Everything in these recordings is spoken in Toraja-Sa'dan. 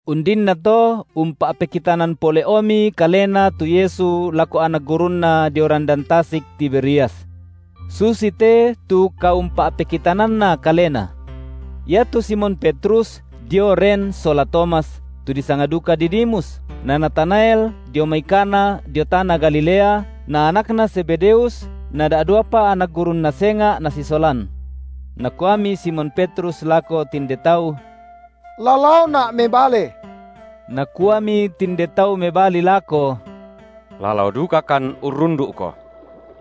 Undinnato umpa’pekitanan pole’omi Kalena tu Yesu lako anak gurunNa dio randan tasik Tiberias. Susite tu kaumpa’pekitananNa Kalena. Iatu Simon Petrus dio ren sola Tomas, tu disanga duka Didimus, na Natanael dio mai Kana dio tana Galilea, na anakna Zebedeus na da’duapa anak gurunNa senga’ nasisolan. Nakuami Simon Petrus lako tinde tau: La laona’ mebale. Nakuami tinde tau mebali lako: La lao dukakan urrundu’ko.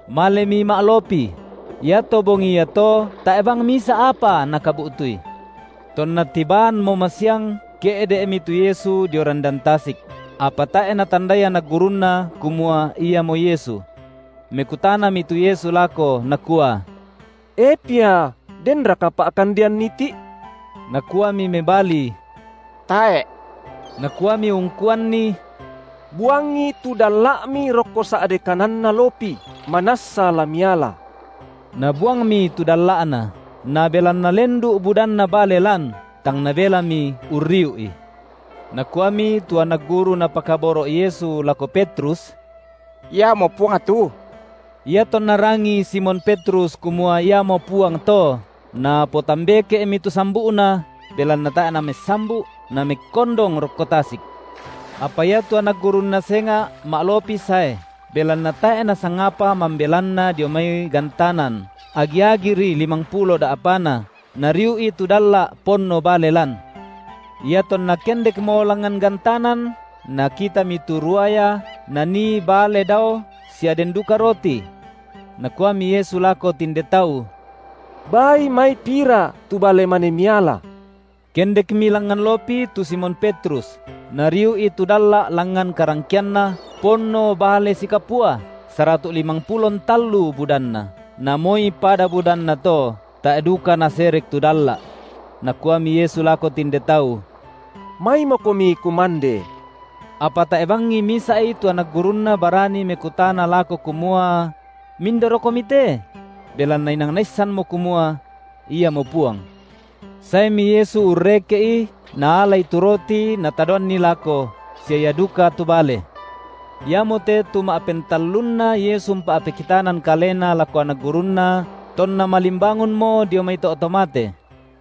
Malemi ma’lopi; iato bongi iato tae’ bang misa’ apa nakabu’tui. Tonna tibaanmo masiang ke’de’mi tu Yesu dio randan tasik; apa tae’ natandai anak gurunNa kumua Iamo Yesu. Mekutanami tu Yesu lako, Nakua: E pia, denraka pa’kandean iti’? Nakuami mebali: Tae’. Nakuami ungkuanni: Buangi tu dalla’mi rokko sa’de kananna lopi, manassa la miala. Nabuangmi tu dalla’na, na belanna lendu’ budanna bale lan, tang nabelami urriu’i. Nakuami tu anak guru Napakaboro’ Yesu lako Petrus: Iamo Puang tu. Iatonna rangii Simon Petrus kumua Iamo Puang to, napotambeke’mi tu sambu’na, belanna tae’ namessambu’, namekkondong rokko tasik. Apa iatu anak gurunNa senga’ ma’lopi sae, belanna tae’ nasangapa mambelanna dio mai gantanan, agi-agiri limangpulo da’pana, nariu’i tu dalla’ ponno bale lan. Iatonna kendekmo langngan gantanan, nakitami tu ruaya, nanii bale dao sia den duka roti. Nakuami Yesu lako tinde tau: Baai mai pira tu bale mane miala. Kendekmi langngan lopi tu Simon Petrus, nariu’i tu dalla’ langngan karangkeanna, ponno bale sikapua, saratu’ limangpulo ntallu budanna. Na moi pada budanna to, tae’ duka naserek tu dalla’. Nakuami Yesu lako tinde tau: Maimokomi kumande. Apa tae’ bangi misa’i tu anak gurunNa barani mekutana lako kumua: Mindarokomi te? Belanna inang naissanmo kumua: Iamo Puang. Saemi Yesu urreke’i Naalai tu roti Natadoanni lako, sia ia duka tu bale. Iamote tu ma’pentallunna Yesu umpa’pekitanan Kalena lako anak gurunNa tonna malimbangunmo dio mai to’ to mate.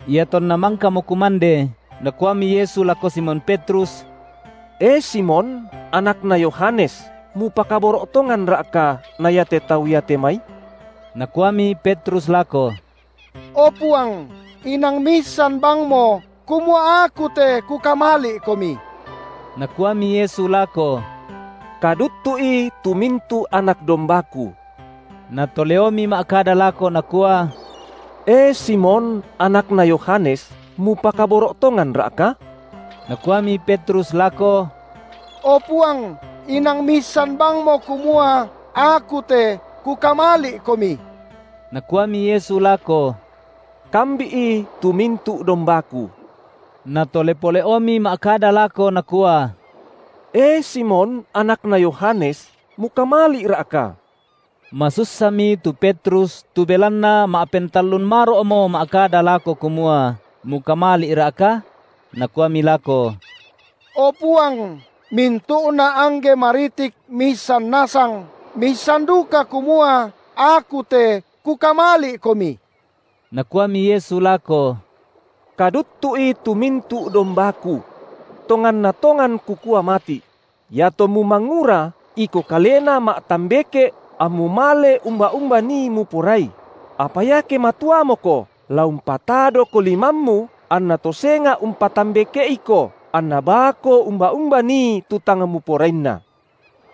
Iatonna mangkamo kumande, Nakuami Yesu lako Simon Petrus: E Simon, anakna Yohanes, mupakaboro’ tonganRa’ka na iate tau iate mai? Nakuami Petrus lako: O Puang, inang Miissan bangmo, kumua aku te kukamali’Komi. Nakuami Yesu lako: Kaduttu’i tu mintu’ anak dombaKu. Natoleomi ma’kada lako nakua: E Simon, anakna Yohanes mupakaboro’ tonganRa’ka? Nakuami Petrus lako: O Puang inang Miissan bangmo kumua aku te kukamali’Komi. Nakuami Yesu lako: Kambi’i tu mintu’ dombaKu. Natole pole’omi ma’kada lako Nakua: E Simon, anakna Yohanes, mukamali’Ra’ka? Masussami tu Petrus tu belanna ma’pentallun maro’mo ma’kada lako kumua: Mukamali’Ra’ka? Nakuami lako: O Puang, mintu’na angge maritik Miissan nasang, Miissan duka kumua aku te kukamali’Komi. Nakuami Yesu lako: Kaduttu’i tu mintu’ dombaKu. Tonganna tongan Kukua mati’: Iatommu mangura, iko kalena ma’tambeke’ ammu male umba-umba nii muporai; apa iake matuamoko, la umpatadoko limammu, anna to senga’ umpatambeke’iko, anna baako umba-umba nii tu tang muporainna.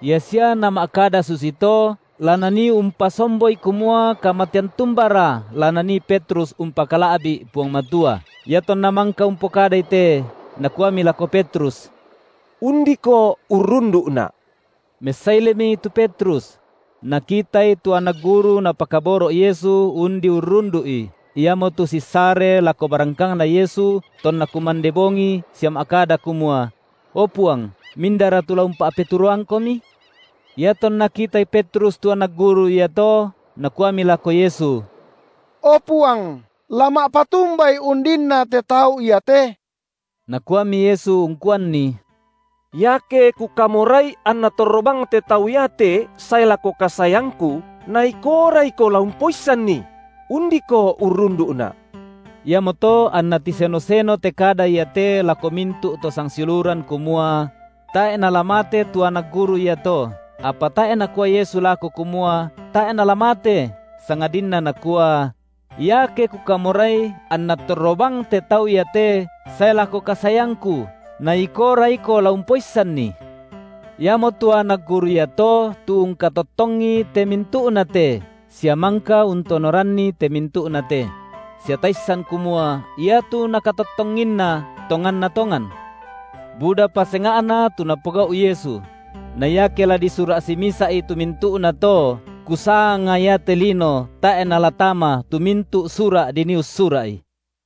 Ia sia Nama’kada susito, la Nanii umpasomboi kumua kamatean tumbara la nanii Petrus umpakala’bi’ Puang Matua. Iatonna mangka umpokadai te, Nakuami lako Petrus: Undiko urrundu’Na’. Messailemi tu Petrus: Nakitai tu anak guru Napakaboro’ Yesu undi urrundu’I, iamotu sissare lako barangkangNa Yesu tonna kumande bongi sia ma’kada kumua: O Puang, mindara tu la umpa’peturoangKomi? Iatonna kitai Petrus tu anak guru iato, nakuami lako Yesu: O Puang, la ma’patumbai undinna te tau iate? Nakuami Yesu ungkuanni: Iake Kukamorai anna torro bang te tau iate sae lako kasaeangKu, na ikoora iko la umpoissanni! Undiko urrundu’Na’. Iamoto anna tiseno-seno te kada iate lako mintu’ to sangsiuluran kumua: Tae’ nala mate tu anak guru iato; apa tae’ Nakua Yesu lako kumua tae’ nala mate sangadinna Nakua: Iake Kukamorai anna torro bang te tau iate sae lako kasaeangKu, na ikoora iko la umpoissanni! Iamotu anak guru iato tu ungkatottongi te mintu’nate, sia mangka untonoranni te mintu’nate; sia taissan kumua iatu nakatottonginna tonganna tongan. Budapa senga’na tu Napogau’ Yesu; na iake la disura’ simisa’i tu mintu’nato, kusanga iate lino tae’ nala tama tu mintu’ sura’ dinii ussura’i.